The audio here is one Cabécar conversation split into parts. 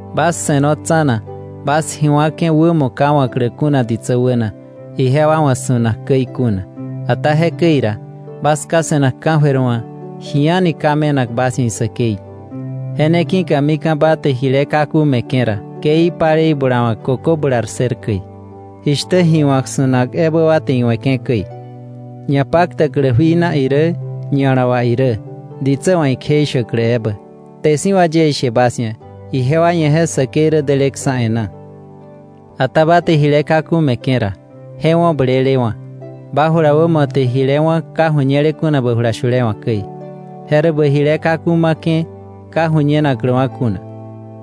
“Bas se̱no tsa̱na bas ji wa̱ke̱ wämo ka wa̱klä kuna ditsä wäna, ijewa wa̱ su̱nak käi kuna. Ata jekäi ra, bas Ká se̱nak ka̱jöir wa̱ ji a̱ni ka me̱nak bas ia̱ isäkei. “Je ne ki̱ka mika̱ ba te jile kaku me̱ke̱ ra, ke ipalei bulawa̱k kökö bular ssër käi, jishtä ji wa̱k su̱nak ebä wa te iwe̱ke̱ käi, ñapaktäklä jui na irä ña̱la wà irä, ditsä wa̱ ikjeishäklä ebä. Kte si̱ wà yie ishe bas ia̱, ijewa ia̱ je säkei rä deleksa̱ e̱ná. Ata ba te jile kaku me̱ke̱ ra, je wo̱ blelewa̱, ba jula wämo te jile wá̱ ka ju̱ñele kuna ba jula shule wa̱ käi; je rä bä jile kaku ma̱ke̱ ka ju̱ñenakläwa̱ kuna.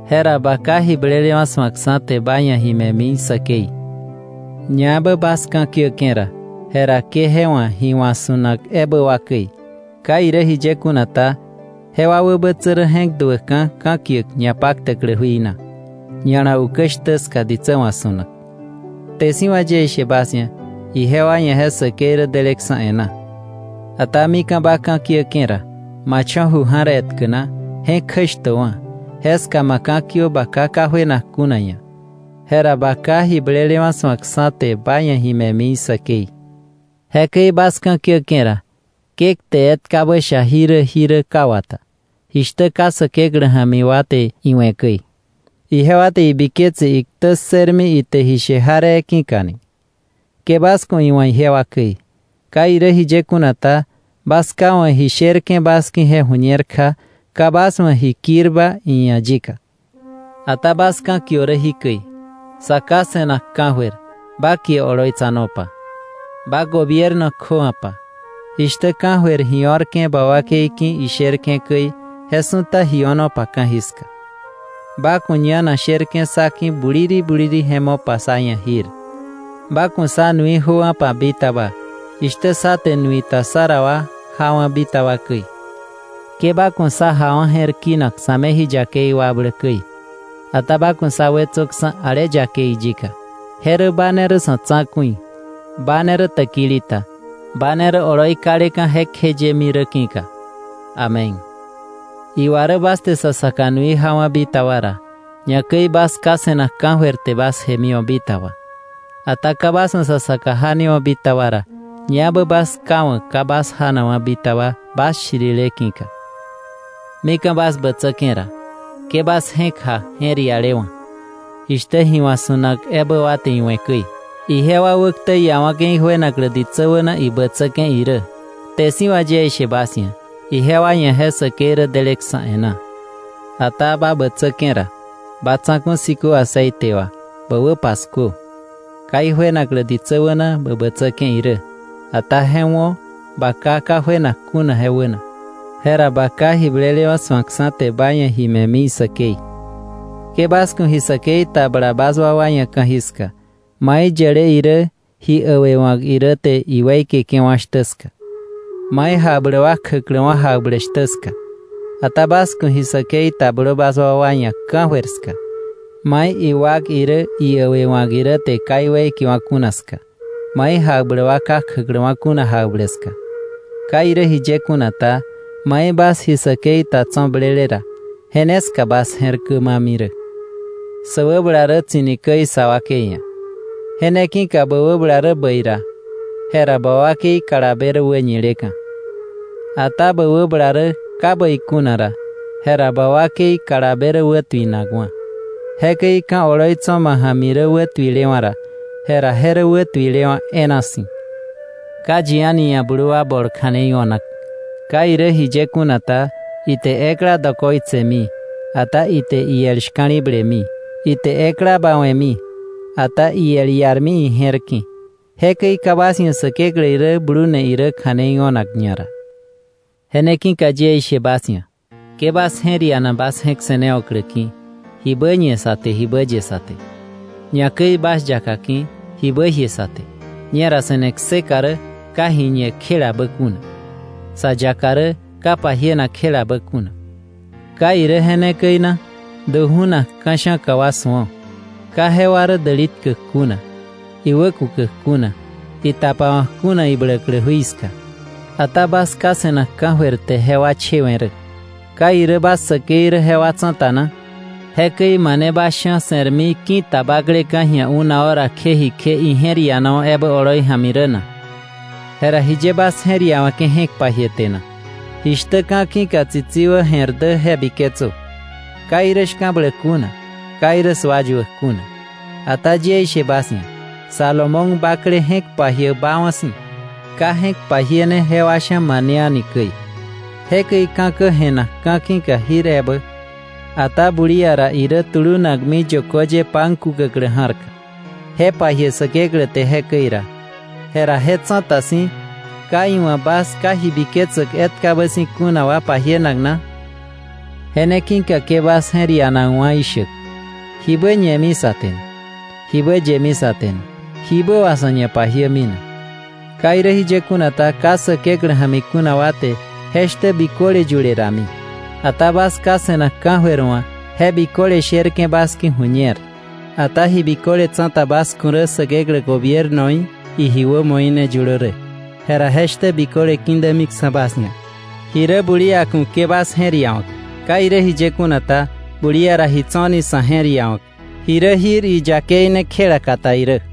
Jera ba Ká, ji blelewa̱ su̱ak, te ba ia̱ ji me̱mi isäkei. “Ñaebä bas ka̱kiäke̱ ra, jera ke je wa̱ ji wa̱k su̱nak ebä wa käi. Ka irä jiye kuna ta, jewa wäbätsä rä je̱k duäkka̱ ka̱kiäk ñapaktäklä jui na, ña̱la ukä shtä ska ditsä wa̱ su̱nak. Kte si̱ wà yie ishe bas ia̱, ijewa ia̱ je säkei rä deleksa̱ e̱ná. Ata mika̱ ba ka̱kiäke̱ ra, ma cho̱ ju ja̱r etkä na, je̱k kjäshtöwa̱; jeska ma ka̱kiö ba Ká ka juenak kuna ia̱. Jera ba Ká, ji blelewa̱ su̱ak, te ba ia̱ ji me̱mi isäkei. “Jekäi bas ka̱kiäke̱ ra, ke kte etkabä sha jirä jirä ka wata, jishtä ka Säkeklä ja̱mi wa te iwe̱ käi, ijewa te ibiketse iktä ssërmi ite ishe jaree ki̱ka ni. Ke bas ku̱ iwa̱ ijewa käi. Ka irä jiye kuna ta, bas Ká wa̱ ji sherke̱ bas ki̱ je ju̱ñer kja ka bas wa̱ ji kirba iia̱ yika. Ata bas ka̱kiö rä jikäi: ‘Sa Ká se̱nak ka̱jöir, ba kie oloitsanopa. Ba gobierno kjöwa̱pa. Jishtä ka̱jöir ji o̱rke̱ ba wakei ki̱ isherke̱ käi, je su̱ta ji o̱nopa ka̱jiska. Ba ku̱ ñanak sherke̱ sá ki̱ buliri buliri je mopa sá ia̱ jir. Ba ku̱ sá nui jöwa̱pa bitaba, jishtä sá te nui ta sá ra wa jawa̱ bitaba käi. Ke ba ku̱ sá jawa̱ je̱r kinak sa̱ me ji yakei wakblä käi, ata ba ku̱ sá wetsöksa̱ ale yakei yika. Je rä ba ne rä sa̱ tsa̱ku̱i, ba ne rä täkili ta, ba ne rä oloi kaleka̱ jekjeyemi rä ki̱ka. Amén.’ “Iwa rä bas te sa saka nui jawa̱ bitaba ra, ñakäi bas Ká se̱nak ka̱jöir te bas jemiwa̱ bitaba. Ata ka bas wa̱ sa saka janewa̱ bitaba ra, ñaebä bas Ká wa̱ ka bas janakwa̱ bitaba bas shirile ki̱ka. “Mika̱ bas bätsäke̱ ra, ke bas je̱k ja je̱r ialewa̱, jishtä ji wa̱k su̱nak ebä wa te iwe̱ käi. Ijewa wäktä iawa̱ke̱ ijuenaklä ditsä wäna ibätsäke̱ irä. Kte si̱ wà yie ishe bas ia̱, ijewa ia̱ je säkei rä deleksa̱ e̱ná. Ata ba bätsäke̱ ra, ma tsa̱ku̱ ki̱ aceite tköka̱, bä wä paskuö, ka ijuenaklä ditsä wäna bä bätsäke̱ irä; ata je wo̱ ba Ká ka juenak kuna je wäna. Jera ba Ká, ji blelewa̱ su̱ak, te ba ia̱ ji me̱mi isäkei. “Ke bas ku̱ ji säkei ta bla bas wakwa ia̱ ka̱jiska, mai yäle irä, ji äwewa̱k irä te iweikeke̱wa̱ shtä ska, mai jakbläk wa kjäkläwa̱ jakbläk shtä ska. Ata bas ku̱ ji säkei ta blö bas wakwa ia̱ ka̱jöir ska, mai iwak irä, iäwëwa̱k irä te ka iweikewa̱ kuna ska, mai jakbläk wa ka kjäkläwa̱ kuna jakbläk ska. Ka irä jiye kuna ta, mai bas ji säkei ta tso̱ blele ra, je ne ska bas je̱r kämami rä. “Sä wäbala rä tsi̱ni käi sa wakei ia̱. Je ne ki̱ka bä wäbala rä bäi ra, jera ba wakei kalabe rä wäñinakka̱. Ata bä wäbala rä ka bäi kuna ra, jera ba wakei kalabe rä wätuinakwa̱. Jekäi ka̱ oloi tso̱ ma ja̱mi rä wätuilewa̱ ra, jera je rä wätuilewa̱ e̱e̱na si̱. “Ka yi a̱ni ia̱ blu wa bol kja̱nei o̱nak. Ka irä jiye kuna ta, ite ekla dokoitsemi, ata ite iel shka̱li̱blemi; ite ekla bawe̱mi, ata iel iarmi ije̱r ki̱. Jekäi ka bas ia̱ Säkeklä irä blune irä kja̱nei o̱nak ñara. “Je ne ki̱ka yie ishe bas ia̱: Ke bas je̱r iana bas je̱k se̱newa̱klä ki̱, jibä ñe sä te, jibä ye sä te; ñakäi bas yaka ki̱, jibä jie sä te. Ñera se̱ne kseka rä ka ji ñe kjelabä kuna; sa yaka rä ka pajienak kjelabä kuna, ¿ka irä je ne käi na? Du ju̱nak ka̱sha̱ka wa su̱o: Ka jewa rä däli tkäk kuna, iwä kukäk kuna, itapawa̱k kuna ibläklä jui ska. Ata bas Ká se̱nak ka̱jöir te jewa chewe̱ rä. ¿Ka irä bas säkei rä jewa tsa̱ta na? Jekäi ¿mane bas sha̱ se̱rmi ki̱ta bakleka̱ ji̱a una hora kje jikje ije̱r ianawa̱ ebä oloi ja̱mi rä na? “Jera ¿jiye bas je̱r iawe̱ke̱ je̱k pajie te na? Jishtä ka̱ ki̱ka tsitsi wä jè̱r dä je biketsö: Ka irä shka̱bläk kuna, ka irä sua yuäk kuna. Ata yie ishe bas ia̱, Salomón bakle je̱k pajiäk baawa̱ si̱, ka je̱k pajiene jewa sha̱ mane a̱ni käi. Jekäi ka̱kä je̱nak ka̱ ki̱ka jir ebä, ata bulia ra irä tulunakmi yökö ye pan kukäklä ja̱rka, je pajie Säkeklä te jekäi ra, jera je tsa̱ta si̱ ¿ka iwa̱ bas ka ji biketsäk etkabä si̱ kuna wa pajienak na? Je ne ki̱ka ke bas je̱r ianakwa̱ ishäk: ¿Jibä ñemi sa te na? ¿Jibä yemi sa te na? ¿Jibä wà sa̱ ñapajiämi na? Ka irä jiye kuna ta, ka Säkeklä ja̱mi kuna wa te je shtä biköle yule rami, ata bas Ká se̱nak ka̱jöir wa̱ je biköle sherke̱ bas ki̱ ju̱ñer. Ata ji biköle tsa̱ta bas ku̱ rä Säkeklä gobiernoí, iji wämoí ne yulö rä, jera je shtä biköle ki̱dämiksa̱ bas ia̱. Ji rä bulia ku̱ ke bas je̱r iawa̱k. Ka irä jiye kuna ta, bulia ra ji tso̱ni sa̱ je̱r iawa̱k. Ji rä jir iyakei ne kjela kata irä.